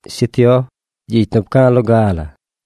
Shi Tioj, gyicy nu pca̱a̱ loga la,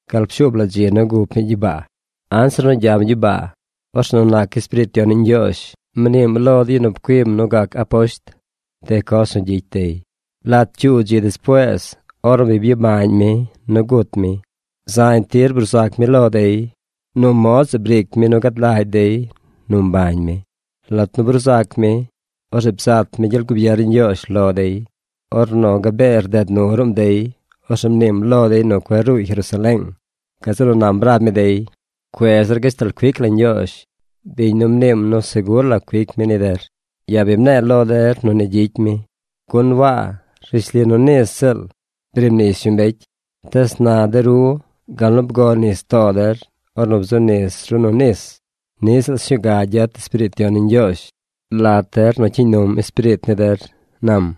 gal pshuub la dzi nu gup mi gyibaa. Anzir nu gyam gyibaa, orzeꞌ nu nac Espiriit Yon ni Ñgyoozh mniim lo de yu nu pcuim nu gac aposht de coz nu gyicy dey. Lat cyuu dzi despuees ornu bi byabañ mi nu gut mi, zañ tir bruu zac mi lo dey. Nu mod zeꞌ briic mi nu gad lagy dey nu mbañ mi. Lat nu bruu zac mi, orzeꞌ bzat mi gyel gubier ni Ñgyoozh lo dey. Ornu gabee rded nu ruꞌm dey, orzeꞌ mniim lo dey nu cueꞌ ruuy Jerusaleeng. Gazeꞌ nu nam rab mi dey: ―Cuez der gashtal cuic la Ñgyoozh biñ nu bi mniim nu segur la cuic mi ni der. Ya̱ bi mne̱e̱ lo der nu ni gyicy mi, Waa rishli nu nis ziꞌl briib nis yu mbecy, tees na de ru gal nu bgo nis too der ornu bzuꞌ nis ru nu nis, niꞌ ziꞌl sñuu ga gyet Espiriit Yon ni Ñgyoozh lat der nu cyiiñ num espiriit ni der ―nam.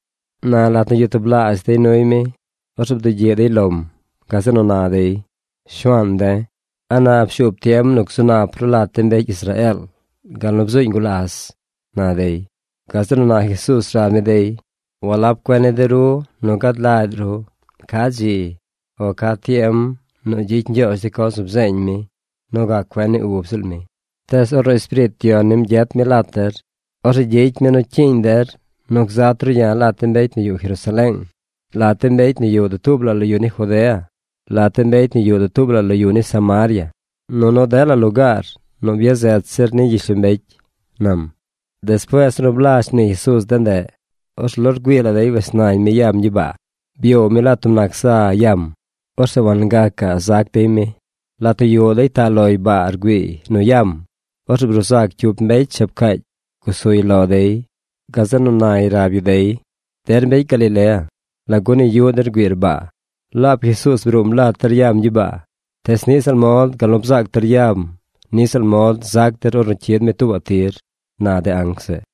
Na lat nu yuꞌ tublaazh dey nuy mi, orzeꞌ bdugyiꞌ dey lom. Gazeꞌ nu na dey: ―Shuaan de̱, ¿a na pshuub tiem nu gzu nap ru lat de mbecy Israeel gal nu bzuuñ gulas? ―na dey. Gazeꞌ nu na Jesuuz rab mi dey: ―Walab cuen ni de ru nu gad lagy ru ca dzi o ca tiem nu gyicy Ñgyoozh de coz nu bzeeñ mi nu gac cuen ni ub ziꞌl mi. Tees ornu Espiriit Yon nim gyet mi lat der, orzeꞌ gyicy mi nu cyiiñ der nu gzat ru ya̱ lat de mbecy nu yuꞌ Jerusaleeng, lat de mbecy nu yuꞌ dutuub la lo yu ni Judea, lat de mbecy nu yuꞌ dutuub la lo yu ni Samaria, nunu dela lugaar nu byazet zir ni gyishlombecy ―nam. Despuees ornu blazh mnii Jesuuz de ndeꞌ, orzeꞌ lo rgüii la dey wes nañ mi yam gyibaa. Byoow mi lat tub nac za yam. Orzeꞌ wangacaꞌ zac dey mi. Lat nu yuꞌ dey taꞌ loy baa rgüiiy nu yam, orzeꞌ bruu zac cyup mbecy shab caacy gusuy lo dey. Gazeꞌ nu nay rab yu dey: ―Der mbecy Galilea, ¿lagu ni yuꞌ der rgüiir baa? Laab Jesuuz bruum lat der yaam gyibaa. Tees niꞌ ziꞌl mod gal nu bzaac der yam niꞌ ziꞌl mod zac der ornu cyid mi tuubaꞌ tir ―na de anc zeꞌ.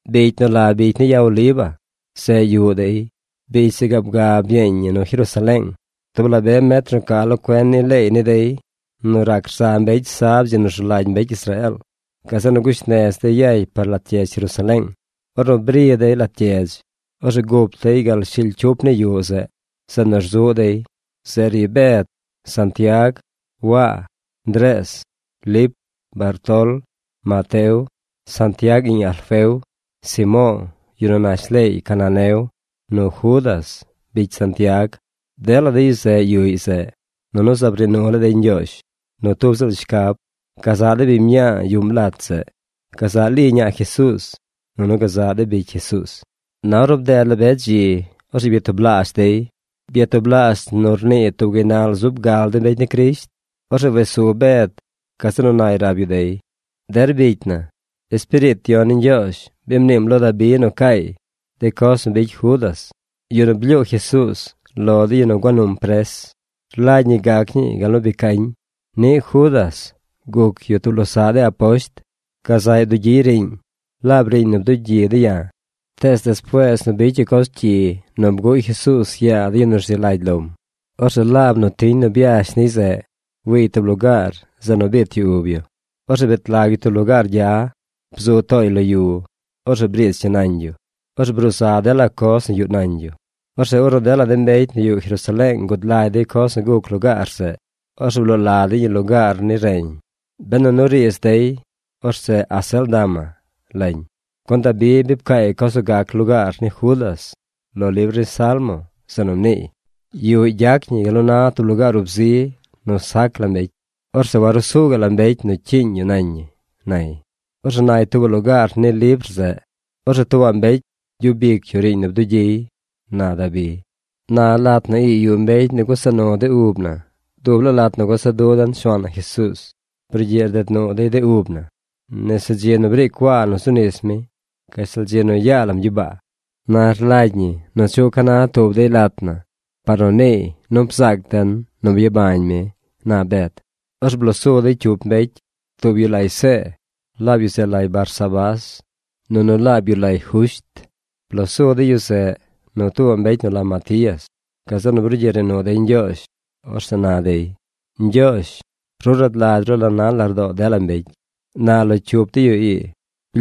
Bicy nu la Bicy ni Ya Oliva, zeꞌ yuꞌ dey. Bicy zeꞌ gaab ga byeeñ ñi nu Jerusaleeng, tub la be metr nu ca lo cuen ni leey ni dey nu rac rza mbecy sab dzi nu rzu lagy mbecy Israeel. Gazeꞌ nu gush nez dey yay par lat gyedz Jerusaleeng. Ornu bri dey lat gyedz, orzeꞌ gup dey gal shily cyup ni yuꞌ zeꞌ, zeꞌ nu rzuꞌ dey. Zeꞌ ri Bed, Santiag, Waa, Ndrees, Lip, Bartol, Mateo, Santiag iꞌñ Alfeo, Simo̱o̱, yu nu nash leey Caneneo, nu Judas, bicy Santiag. Dela de yu zeꞌ yuꞌy zeꞌ. Nunu zaab rnii nu laa dey Ñgyoozh nu tub ziꞌl shcab: gazaꞌ de biñ mñaa yuꞌm lat zeꞌ, gazaꞌ Li ñaa Jesuuz, nunu gazaꞌ de bicy Jesuuz. Na ornu bded la be dzi, orzeꞌ byatublaazh dey. Byatublaazh nu rnii tub gaynal zub gal de mbecy ni Crisht. Orzeꞌ wes su Bed. Gazeꞌ nu nay rab yu dey: ―Der bicy na, Espiriit Yon ni Ñgyoozh bi mniim lo Dabi nu caay de coz nu bicy Judas, yu nu blyuu Jesuuz lo de yu nu gua num pres. Rlagy ñi gac ñii gal nu bi cañ. Niꞌ Judas guc yu tub losaꞌ de aposht. Gazaꞌy bdugyiy riiñ, laab riiñ nu bdugyi de̱ ya̱. Tees despuees nu bicy yu coz cyi nu bguꞌy Jesuuz yaa de yu nu rzi lagy lom, orzeꞌ laab nu tiñ nu byash niy zeꞌ wiiy tub lugaar zeꞌ nu biit yu ub yu. Orzeꞌ bet lag yu tub lugaar gya. Bzu tooy lo yu. Orzeꞌ briich ñi nañ yu. Orzeꞌ bruu za dela coz nu yuꞌ nañ yu. Orzeꞌ ornu dela de mbecy nu yuꞌ Jerusaleeng gud lagy dey coz nu guc lugaar zeꞌ, orzeꞌ bloo la dey ñi Lugaar ni Reñ. Benu nu riidz dey, orzeꞌ Acéldama lañ. Gun Dabi bi pcaay coz nu gac lugaar ni Judas lo libr ni Salmo, zeꞌ nu mniiy: Yuꞌy gyac ñi gal nu na tub lugaar ub zi nu sac la mbecy. Orzeꞌ waruu su gaꞌ la mbecy nu cyiiñ yu nañ ñi, nay. Orzeꞌ nay tuubaꞌ lugaar ni libr zeꞌ: Orzeꞌ tuubaꞌ mbecy gyub ic yu riiñ nu bdugyiy, na Dabi. ’Na lat na ii yuꞌ mbecy nu gusa nu de ub na dub laa lat nu gusa dun Shuaan na Jesuuz. Brugyiꞌ rded nu dey de ub na nese dzi nu briic Waa nu zu nis mi, gashtal dzi nu yaa lam gyibaa. Na rlagy ñi nu chuꞌ ca na tub dey lat na par nu niiy nu bzaac den nu byabañ mi ―na Bed. Orzeꞌ bloo su dey cyup mbecy. Tub yu lay See, laab yu zeꞌ lay Barsabás, nunu laab yu lay Jusht. Bloo su dey yu zeꞌ nu tuubaꞌ mbecy nu la Matías. Gazeꞌ nu brugyiꞌ rnii nu dey Ñgyoozh. Orzeꞌ na dey: ―Ñgyoozh, ru rad lagy ru la na lardoo dela mbecy. Na lo cyup de yu ii,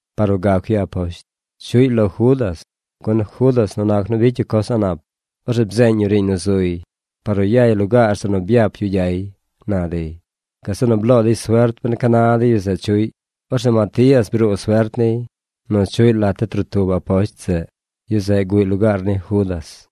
par nu gac yu aposht. Chuꞌy lo Judas. Gun Judas nu nac nu bicy yu coz a̱ꞌ nap, orzeꞌ bzeeñ yu riiñ nu zuy par nu yay lugaar zeꞌ nu byap yu gyay ―na dey. Gazeꞌ nu bloo dey suert ben ca na de yu zeꞌ chuꞌy. Orzeꞌ Matías bruu suert niy nu chuꞌy lat de trotub aposht zeꞌ. Yu zeꞌ guꞌy lugaar ni Judas.